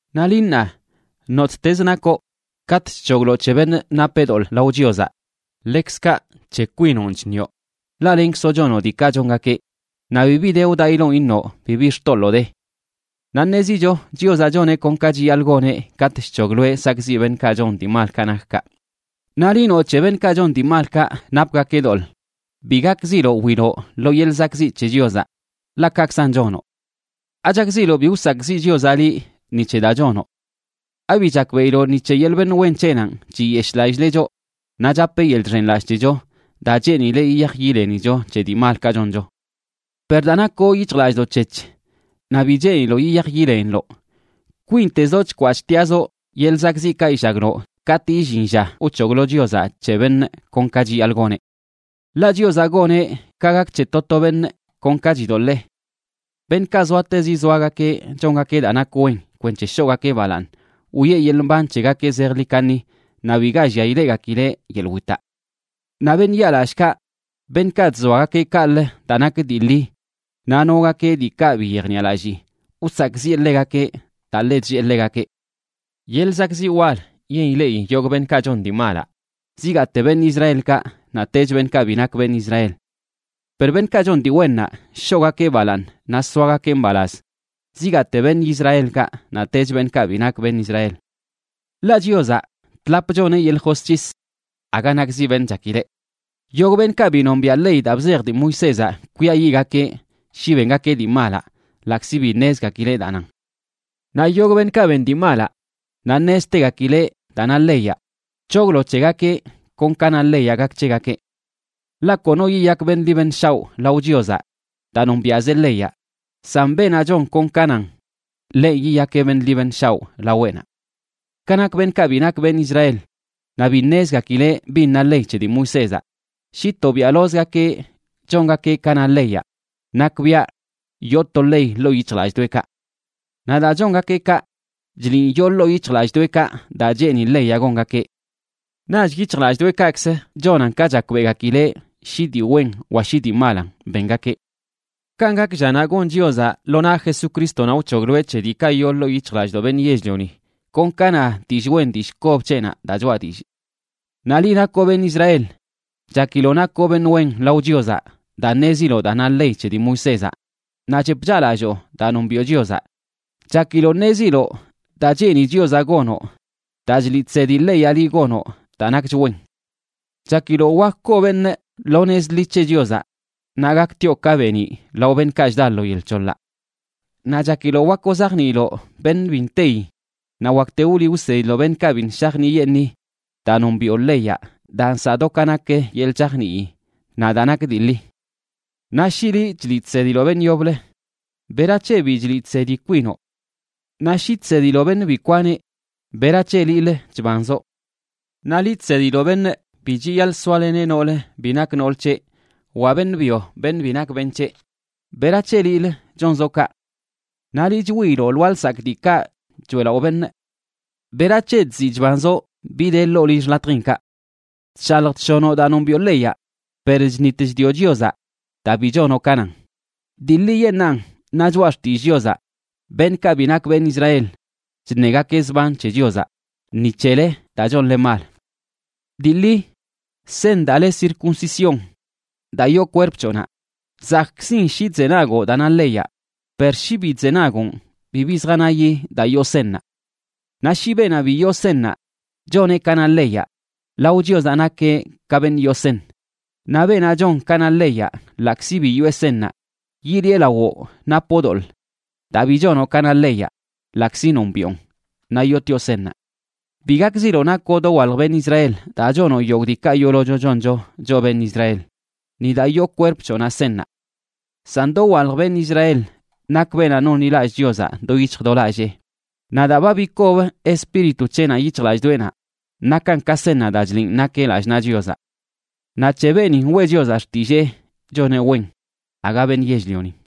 Naꞌ liꞌ ṉaa, nottezə nakoꞌ, katꞌ chc̱hogloꞌ c̱he beṉꞌ napeꞌ doḻꞌ lao Chiozaꞌ, ḻekzkaꞌ c̱he kwinonꞌ chṉioꞌ, ḻaꞌ lenkzoꞌ chonoꞌ diikaꞌ chongakeꞌ, naꞌ bibi de wdaꞌiloꞌn iṉoꞌ bibi xtoḻoo de. Naꞌ ṉezicho Chiozaꞌ choneꞌ kon ka chiyaḻꞌ goneꞌ katꞌ chc̱hogloeꞌ sakꞌziꞌ beṉꞌkaꞌ chon dii malkaꞌ nak kaꞌ. Naꞌ liꞌ noꞌ c̱he beṉꞌkaꞌ chon dii malkaꞌ napgakeꞌ doḻꞌ, bi gakziloꞌ wiloꞌ lo yeḻꞌ zakꞌziꞌ c̱he Chiozaꞌ, ḻaꞌ kaꞌkzan chonoꞌ. ¿Achakziloꞌ bi wsakꞌziꞌ Chiozaꞌ liꞌ ni c̱he daa chonoꞌ? ¿Abi chakbeꞌiloꞌ ni c̱he yeḻꞌ beṉꞌ wen c̱heꞌnanꞌ chiyeshꞌlallileꞌ choꞌ naꞌ chapeꞌ yeḻꞌ chxenlallꞌ c̱hecho, daa cheenileꞌ yiyaj yilenicho c̱he dii malkaꞌ choncho? Per daa nakoꞌ yic̱hjlallꞌdoꞌ c̱hec̱h naꞌ bi cheeniloꞌ yiyaj yileniloꞌ, kwintezoꞌ chkwaꞌ chtiꞌazoꞌ yeḻꞌ zakꞌziꞌkaꞌ illagloꞌ katꞌ illin lla wc̱hoglo Chiozaꞌ c̱he beṉꞌ kon ka chiyaḻꞌ goneꞌ. Ḻaꞌ Chiozaꞌ goneꞌ ka gak c̱he to to beṉꞌ kon ka chidoḻee. Beṉꞌkaꞌ zoatezi zoagakeꞌ chongakeꞌ daa nak wen kwenc̱he shoꞌgakeꞌ balaaṉ, wiꞌe yeḻꞌ mban c̱hegakeꞌ zejḻi kaṉi naꞌ biga llia ileꞌgakileꞌ yeḻꞌ witaꞌ. Naꞌ beṉꞌ yaalallꞌkaꞌ, beṉꞌkaꞌ chzoagakeꞌ kaꞌlə daa nak dii ḻi naꞌ nogakeꞌ diikaꞌ bi yejniꞌalallii, wsakꞌziꞌe ḻegakeꞌ daa ḻe chllee ḻegakeꞌ. Yeḻꞌ zakꞌziꞌ wal yen ileꞌi yogꞌ beṉꞌkaꞌ chon dii malaꞌ, zigaate beṉꞌ Israelkaꞌ naꞌtech beṉꞌkaꞌ bi nak beṉꞌ Israel. Per beṉꞌkaꞌ chon dii wennaꞌ, shoꞌgakeꞌ balaaṉ naꞌ soagakeꞌ mbalaz, zigaate beṉꞌ Israelkaꞌ naꞌtech beṉꞌkaꞌ bi nak beṉꞌ Israel. Ḻaꞌ Chiozaꞌ, tlap choneꞌ yeḻꞌ josc̱his, aga nakzi beṉꞌ chakileꞌ. Yogꞌ beṉꞌkaꞌ bi nombiaꞌ ley daa bzej dii Moisézaꞌ kwiayiꞌgakeꞌ shi bengakeꞌ dii malaꞌ, ḻaꞌkzi bi ṉezgakileꞌ daa nan. Naꞌ yogꞌ beṉꞌkaꞌ ben dii malaꞌ naꞌ ṉeztegakileꞌ daa na leyaꞌ, c̱hoglo c̱hegakeꞌ kon ka na leyaꞌ gak c̱hegakeꞌ. Ḻaꞌ kono yiyak beṉꞌ ḻi beṉꞌ shaoꞌ lao Chiozaꞌ daa nombiaꞌzeꞌ leyaꞌ, san beenaꞌ chon kon ka nan, ḻenꞌ yiyakeꞌ beṉꞌ ḻi beṉꞌ shaoꞌ laweꞌnaꞌ. Ka nak beṉꞌkaꞌ bi nak beṉꞌ Israel naꞌ bi ṉezgakileꞌ bin na ley c̱he dii Moisézaꞌ, shi tobiaꞌlozgakeꞌ chongakeꞌ ka na leyaꞌ, nakbiaꞌ yoo to ley ḻoo yic̱hjlallꞌdoꞌekaꞌ. Naꞌ daa chongakeꞌ kaꞌ, chliꞌn yoo ḻoo yic̱hjlallꞌdoꞌekaꞌ daa cheeni leyaꞌ gongakeꞌ. Naꞌch yic̱hjlallꞌdoꞌekaꞌkzə chonan ka chakbeꞌgakileꞌ shi dii wen wa shi dii malan bengakeꞌ. Kanꞌ gak llanaꞌ gon Chiozaꞌ lo naꞌ Jesucrístonaꞌ wc̱hogloeꞌ c̱he diikaꞌ yoo ḻoo yic̱hjlallꞌdoꞌ beṉꞌ yell-lioni, kon ka na dillꞌ wen dillꞌ kob c̱heꞌnaꞌ daa choꞌa dillꞌ. Naꞌ liꞌ nakoꞌ beṉꞌ Israel, chakiloꞌ nakoꞌ beṉꞌ wen lao Chiozaꞌ daa ṉeziloꞌ daa na ley c̱he dii Moisézaꞌ naꞌ chep chaꞌlalloo daa nombiꞌo Chiozaꞌ. Chakiloꞌ ṉeziloꞌ daa cheeni Chiozaꞌ gonoꞌ daa chliꞌ chsedi leyaꞌ liꞌ gonoꞌ daa nakch wen. Chakiloꞌ wak koo beṉꞌ lo nez ḻi c̱he Chiozaꞌ naꞌ gaktioꞌ ka beeniꞌ lao beṉꞌkaꞌ chda lo yel c̱hoḻaꞌ. Naꞌ chakiloꞌ wak wzajniiloꞌ beṉꞌ bi nteyi naꞌ wakte wliꞌ wsediloꞌ beṉꞌkaꞌ biṉꞌ shajniꞌyeṉii daa nombiꞌo leyaꞌ daa nsaꞌ do ka nak yeḻꞌ chajnii naꞌ daa nak dii ḻi. Naꞌ shi liꞌ chliꞌ chsediloꞌ beṉꞌ yoblə, ¿berac̱he bi chliꞌ chsedi kwinoꞌ? Naꞌ shi chsediloꞌ beṉꞌ bi kwaneꞌ, ¿berac̱he liꞌlə chbanzoꞌ? Naꞌ liꞌ chsediloꞌ beṉꞌ bi chiyaḻꞌ soaleneꞌ nool bi nak nool c̱heꞌ, wa beṉꞌ byo beṉꞌ bi nak beṉꞌ c̱heꞌ, ¿berac̱he liꞌlə chonzoꞌ kaꞌ? Naꞌ liꞌ chwiiloꞌ lwaa lsakꞌ diikaꞌ choeꞌlaꞌo beṉꞌ, ¿berac̱he chziꞌ chbanzoꞌ bi de ḻoo lill xḻatjinkaꞌ? Chshalj chshonoꞌ daa nombiꞌo leyaꞌ, per chṉit chdioꞌ Chiozaꞌ daa bi chonoꞌ ka nan. Dii ḻiyeṉꞌnan na Choꞌa Xtillꞌ Chiozaꞌ: “Beṉꞌkaꞌ bi nak beṉꞌ Israel chṉegakeꞌ zban c̱he Chiozaꞌ ni c̱hele daa chonle mal.” Dii ḻi seṉ daa le circuncisión daa yoo kwerp c̱hoꞌnaꞌ zakꞌkzin shi chzenagoꞌ daa na leyaꞌ, per shi bi chzenagoꞌn bibi zjanayi daa yoo seṉnaꞌ. Naꞌ shi beenaꞌ bi yoo seṉnaꞌ choneꞌ ka na leyaꞌ, lao Chiozaꞌ nakeꞌ ka beṉꞌ yoo seṉ. Naꞌ beenaꞌ chon ka na leyaꞌ ḻaꞌkzi bi yoꞌe seṉnaꞌ, yiliꞌe lawoꞌ napoꞌ doḻꞌ daa bi chonoꞌ ka na leyaꞌ ḻaꞌkzi nombiꞌon naꞌ yootioꞌ seṉnaꞌ. Bi gakziloꞌ nakoꞌ dowalj beṉꞌ Israel daa chonoꞌ yogꞌ diikaꞌ yoolocho choncho choꞌ beṉꞌ Israel, ni daa yoo kwerp c̱hoꞌnaꞌ seṉnaꞌ. San dowalj beṉꞌ Israel nak beenaꞌ nonḻilallꞌ Chiozaꞌ do yic̱hj do lallee, naꞌ daa ba bikob Espíritu c̱heꞌnaꞌ yic̱hjlallꞌdoꞌenaꞌ nakan ka seṉnaꞌ daa chliꞌn nakeꞌ lallꞌ naꞌ Chiozaꞌ. Naꞌ c̱he beenin weꞌ Chiozaꞌ xtillee choneꞌ wen, aga beṉꞌ yell-lionin.